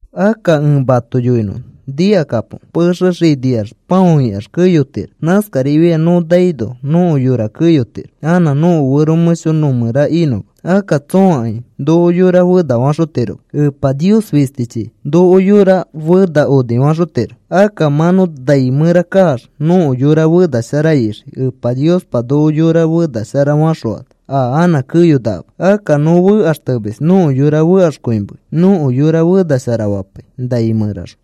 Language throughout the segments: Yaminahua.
Akka ẽ mato yoinõ nikakapo. Pexe xiniax pão ikax keyotiro. Nãskarifiai nõ naino nõko yora keyotiro anã nõko fero mẽsho nõ mẽra inõma. Akka tsõakai noko yora fenafaxotiroma. Epa Nios fistichi noko yora fena onifaxotiro. Akka mã nõ nai mẽra kaax nõko yora fena shara ixii. Epa Niospa noko yora fena shara faxõano a anã keyonakama. Akka nõ fekaxtemis nõko yora fekaxkõimei. Nõko yora fenashara fapai nai mẽraxõ.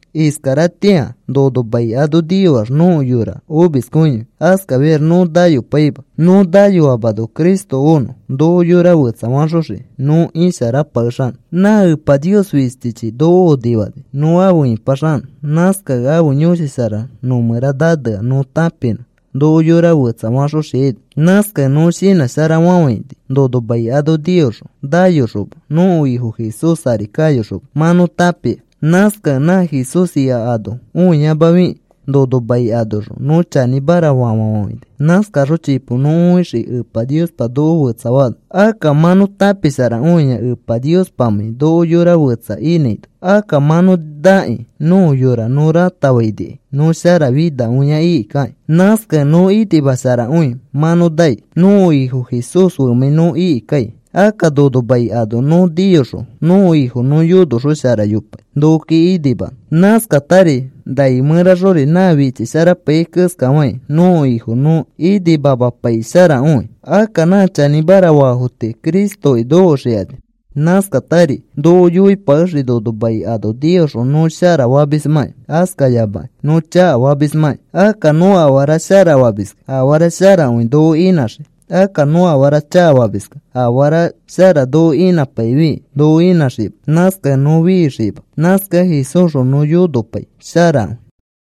Iskaratĩa nono mai ano niyoax nõko yora omiskõiyoi. Askafiax nõ nayopaima. Nõ nayoamano Cristo onõ noko yora fetsafaxoxiki nõ isharapakexanõ. Nã Epa Nios fistichi noko onifani nõ afe ĩpaxanõ. Nãskakẽ ãfe Yõshi Shara nõ mẽra nanea nõ tãpinõ noko yora fetsa faxoxiaino. Nãskakẽ nõ shinãsharafafãini nono mai ano niyoxõ, nayoxoma, nõko Ifo Jesús ari kayoxoma mã nõ tãpia. Nãskakẽ nã Jesús ika ano õiyamafikĩ nono mai anoxõ nõ chanĩmara fafafafãini. Nãskaxõ chipo nõ õixii Epa Niospa noko fetsafaano. Akka mã nõ tãpisharakõia Epa Niospamãi noko yora fetsa inãino. Akka mã nõ nakĩ nõko yora nõ ratafainikai nõ sharafinakõia ikikakĩ. Nãskakẽ nõ inimasharakõi mã nõ nai nõko Ifo Jesús femãi nõ ikikai. Akka nono mai ano nõ niyoxõ nõko Ifo nõ yonoxosharayopai nokoki inimanõ. Nãskatari nai mẽraxori na fischisharapaiyai keskafakĩ nõko Ifo nõ inimamapaisharakõi. Akka nã chanĩmara faafo tii Cristoki nokoxikani. Nãskatari noko yoipakexii nono mai ano niyoxõ nõ shara famismãkĩ, askayamakĩ nõ chakafamismãki. Akka nõ afara shara famiskẽ afara sharakõi noko inãxii. Akka nõ afara chakafamiskẽ afara shara noko inãpaifikĩ noko inãxima. Nãskakẽ nõ fixiima. Nãskakẽ Jesúsxõ nõ yonopai sharakõi.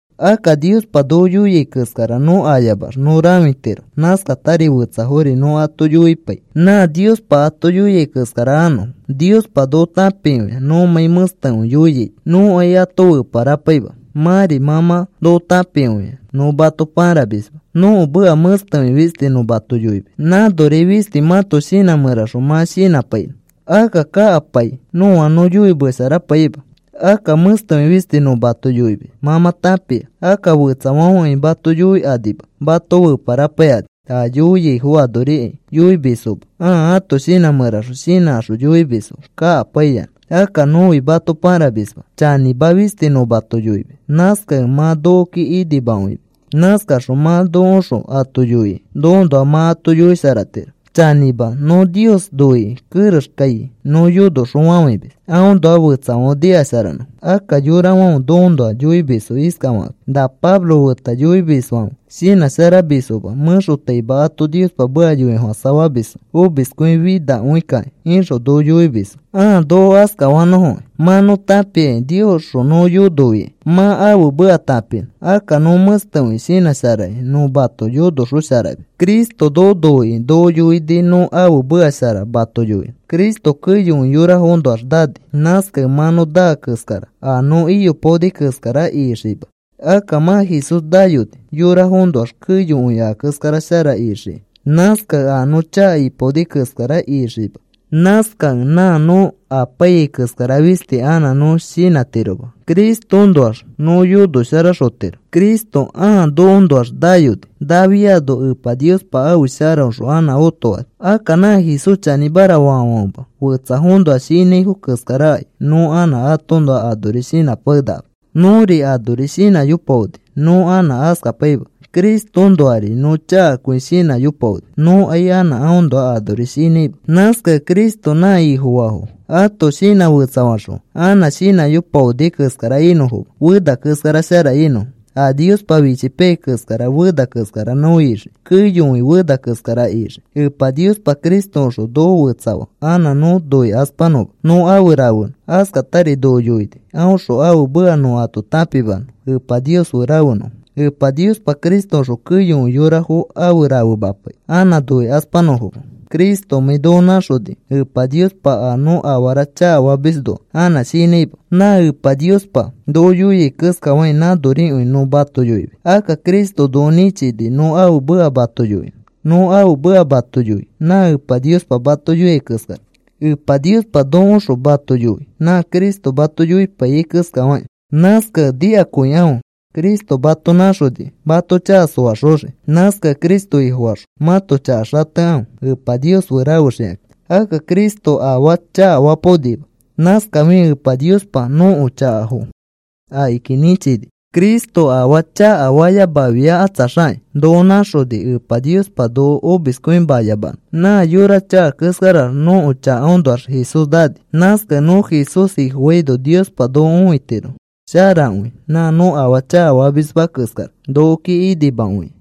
Akka Niospa noko yoia keskara nõ ayamax nõ rãfitiro. Nãskatari fetsafori nõ ato yoipai nã Niospa ato yoiai keskara anõfo. Niospa noko tãpikõia nõmãi mẽstekõi yoiaito. Nõkai ato feparapaima. Mãri mã mã noko tãpikõia nõ mato pãramisma. Nõko meka mẽstekõi fisti nõ mato yoimis. Nãnori fisti mãto shinã mẽraxõ mã shinãpainõ. Akka kakapai nõa nõ yoimesharapaima. Akka mẽstekõi fisti nõ mato yoimis, mã mã tãpia. Akka fetsafãfekai mato yoikõikanima mato feparapaikani. A yoiaifo anorikai yoimisfoma ãa ãto shinã mẽraxõ shinãkaxõ yoimisfo kakapaiyanã. Akka nõfi mato pãramisma, chanĩma fisti nõ mato yoimis. Nãskakẽ mã nokoki inimakõimis. Nãskaxõ mã nokoõxõ ato yoikĩ nokoõnoa mã ato yoisharatiro. Chanĩma, nõ Nios noikĩ kerexkai nõ yonoxofafãimis aõnoa fetsafãfe nikasharanõfo. Akka yorafãfe nokoõnoa yoimisfo iskafakakĩ: “Na Pablo feta yonomisfãfe shinãsharamisfoma mẽxotaima ato Niospa meka yoifofãsafamisfo omiskõifinafikakĩ,” ixõ noko yoimisfo. Ãa noko askafanõfokĩ mã nõ tãpiakĩ Niosxõ nõ yonofikai mã ãfe meka tãpinõ. Akka nõ mẽstekõi shinãsharakĩ nõ mato yonoxosharamis. Cristo noko noikĩ noko yoini nõ ãfe meka shara mato yoinõ. Cristo keyokõi yorafoõnoax naani. Nãskakẽ mã nõ naa keskara a nõ iyopaoni keskara ixikima. Akka mã Jesús nayoni yorafoõnoax keyokõi a keskara shara ixiki. Nãskakẽ a nõ chaka ipaoni keskara ixiima. Nãskakẽ nã nõ apaiyai keskara fisti anã nõ shinãtiroma. Cristoõnoax nõ yonosharaxotiro. Cristo ãa nokoõnoax nayoni. Nafiano Epa Niospa ãfe sharaõxõ anã otofani. Akka nã Jesús chanĩmara faafãfema fetsafoõnoa shinãifo keskarakai nõ anã atoõnoa anori shinãpakenakama. Nõri anori shinãyopaoni nõ anã askapaima. Cristoõnoari nõ chakakõi shinãyopaoni. Nõkai anã aõnoa anori shinãima. Nãskakẽ Cristo nã Ifofaafo ato shinã fetsafaxõa anã shinãyopaoni keskara inõfoma, fena keskara shara inõfo. A Niospa fichipaiyai keskara fena keskara nõ ixii. Keyokõi fena keskara ixii. Epa Niospa Cristoõxõ noko fetsafaa anã nõ noikaspanõma, nõ afe rafenõ. Askatari noko yoini aõxõ ãfe meka nõ ato tãpimanõ Epa Nios fe rafenõfo. Epa Niospa Cristoõxõ keyokõi yorafo afe rafemapai anã noikaspanõfoma. Cristomãi noko nãxonikẽ Epa Niospa a nõ afara chakafamisnoa anã shinãima. Nã Epa Niospa noko yoia keskafakĩ nãnorikõi nõ mato yoimis. Akka Cristo noko nĩchini nõ ãfe meka mato yoinõ. Nõ ãfe meka mato yoi nã Epa Niospa mato yoiai keskara. Epa Niospa nokoõxõ mato yoi nã Cristo mato yoipaiyai keskafakĩ. Nãskakẽ nikakõikãfe Cristo mato nãxonikĩ mato chaka soaxoxiki. Nãskakẽ Cristo Ifofaxõ mãto chaka xatekãfe Epa Nios fe rafexikakĩ. Akka Cristo afaa chakafapaonima. Nãskafikẽ Apa Niospa nõko chakafo akiki nĩchini. Cristo afaa chakafayamafiakatsaxakĩ noko nãxoni Epa Niospa noko omiskõimayamanõ. Nã yora chaka keskarax nõko chakafoõnoax Jesús nani. Nãskakẽ nõ Jesús Ifofaino Niospa noko õitiro sharakõi nã nõ afaa chakafamisma keskara, nokoki inimakõikĩ.